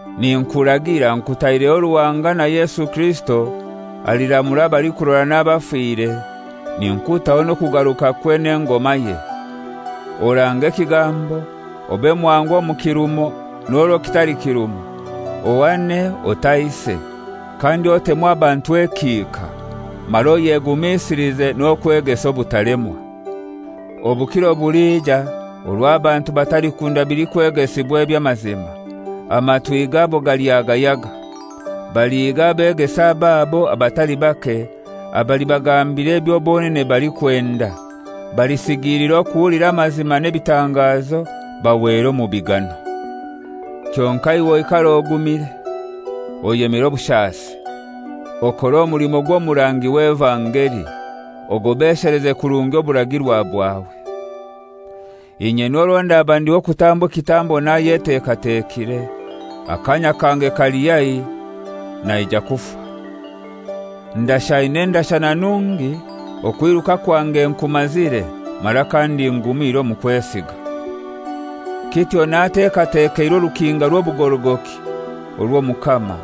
Ninkuragira nkutaireho Ruhanga na Yesu Kirisito aliramura abalikurora n'abafire, ninkutaho n'okugarukakwe n'engomaye: Orange ekigambo, obe mwangu omu kirumo n'orwo kitali kirumo, ohane, otaise, kandi otemu abantu ekihika, mara oyegumisilize n'okwegesa obutalemwa. Obukiro bulija orwo abantu batalikunda bilikwegesibwa eby'amazima. Amatwi gabo galyagayaga. Balihiga abeegesa ababo abatali bake abalibagambira ebyo bonene balikwenda. Balisigiilira okuhulira amazima n'ebitangazo bahwere omu bigano. Kyonkai iwe oikare ogumire, oyemere obushasi, okore omulimo gw'omurangi w'evangeli, ogobesheleze kurungi oburagirwa bwawe. Inye n'orwo ndaba ndi w'okutambwa ekitambo nayetekatekire; akaanya kange kali haihi, naija kufa. Ndashaine endashana nungi, okwiruka kwange nkumazire, mara kandi ngumire omu kwesiga. Kityo natekatekeirwe orukinga rw'obugorogoki orwo Omukama,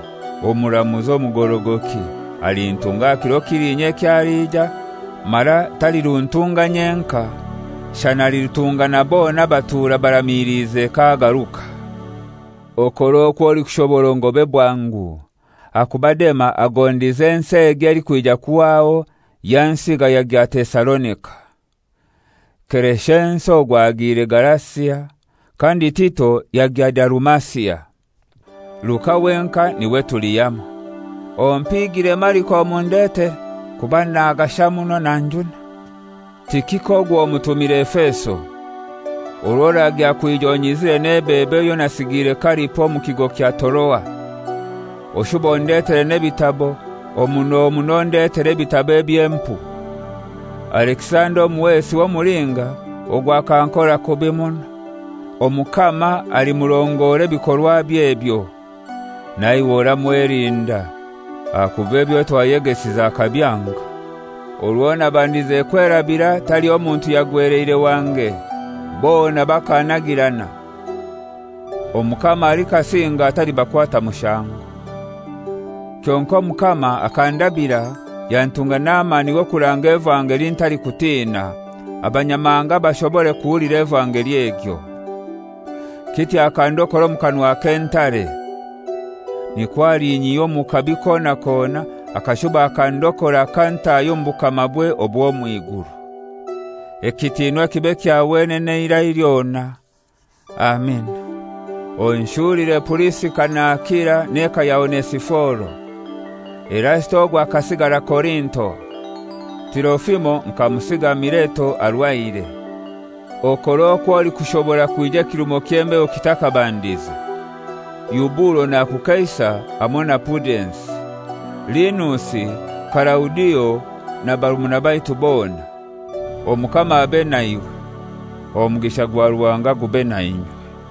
omuramuzi omugorogoki, alintunga aha kiro kiliinya eky'aliija, mara taliruntunga nyenkai, shana alirutunga na bona abatuura baramiliize k'agaruka. Okore okw'olikushobora ongobe bwangu. Ahakuba Dema agondize ensi egi elikwija kuhwaho, yansiga yagya Tesalonika. Kereshensi ogwo agiire Galasia, kandi Tito yagya Dalumasia. Luka wenkai niwe tuli hamoi. Ompiigire Mariko omundetere, kuba nagasha muno, nanjuna. Tikiko ogwo mutumire Efeso. Orwo oragya kwija onyizire n'ebebo eyo nasigiire Karipo omu kigo kya Toroa. Oshube ondetere n'ebitabo, omuno muno ondetere ebitabo eby'empu! Alekisanda omuhesi w'omulinga ogwo akankora kubi muno; Omukama alimurongora ebikorwabye ebyo. Na iwe oramwelinda, ahakuba ebyo twayegesize akabyanga. Orwo nabandize kwerabira taliho muntu yagweleire wange; bona bakannagirana. Omukama alikasinga atalibakwata mushango! Kyonkai Omukama akandabira, yantunga n'amani g'okuranga evangeli ntalikutina, Abanyamahanga bashobore kuhulira evangeli egyo. Kityo akandokora omu kanwa k'entare. Nikwo alinyihya omu kabi kona kona, akashuba akandokora akantaahya omu bukamabwe obw'omw'iguru. Ekitiinwa kibe kya wenene eira lyona. Amina. Onshulire Purisika na Akila n'eka ya Onesiforo. Erasito ogwo akasigara Korinto; Tirofimo nkamusiga Mileto arwaire. Okore okwo olikushobora kwija ekirumo ky'embeho kitakabandize. Eubulo nakukeisa hamoi na Pudensi, Linusi, Kalaudio na barumuna baitu bona. Omukama abe naiwe. Omugisha gwa Ruhanga gube nainywe.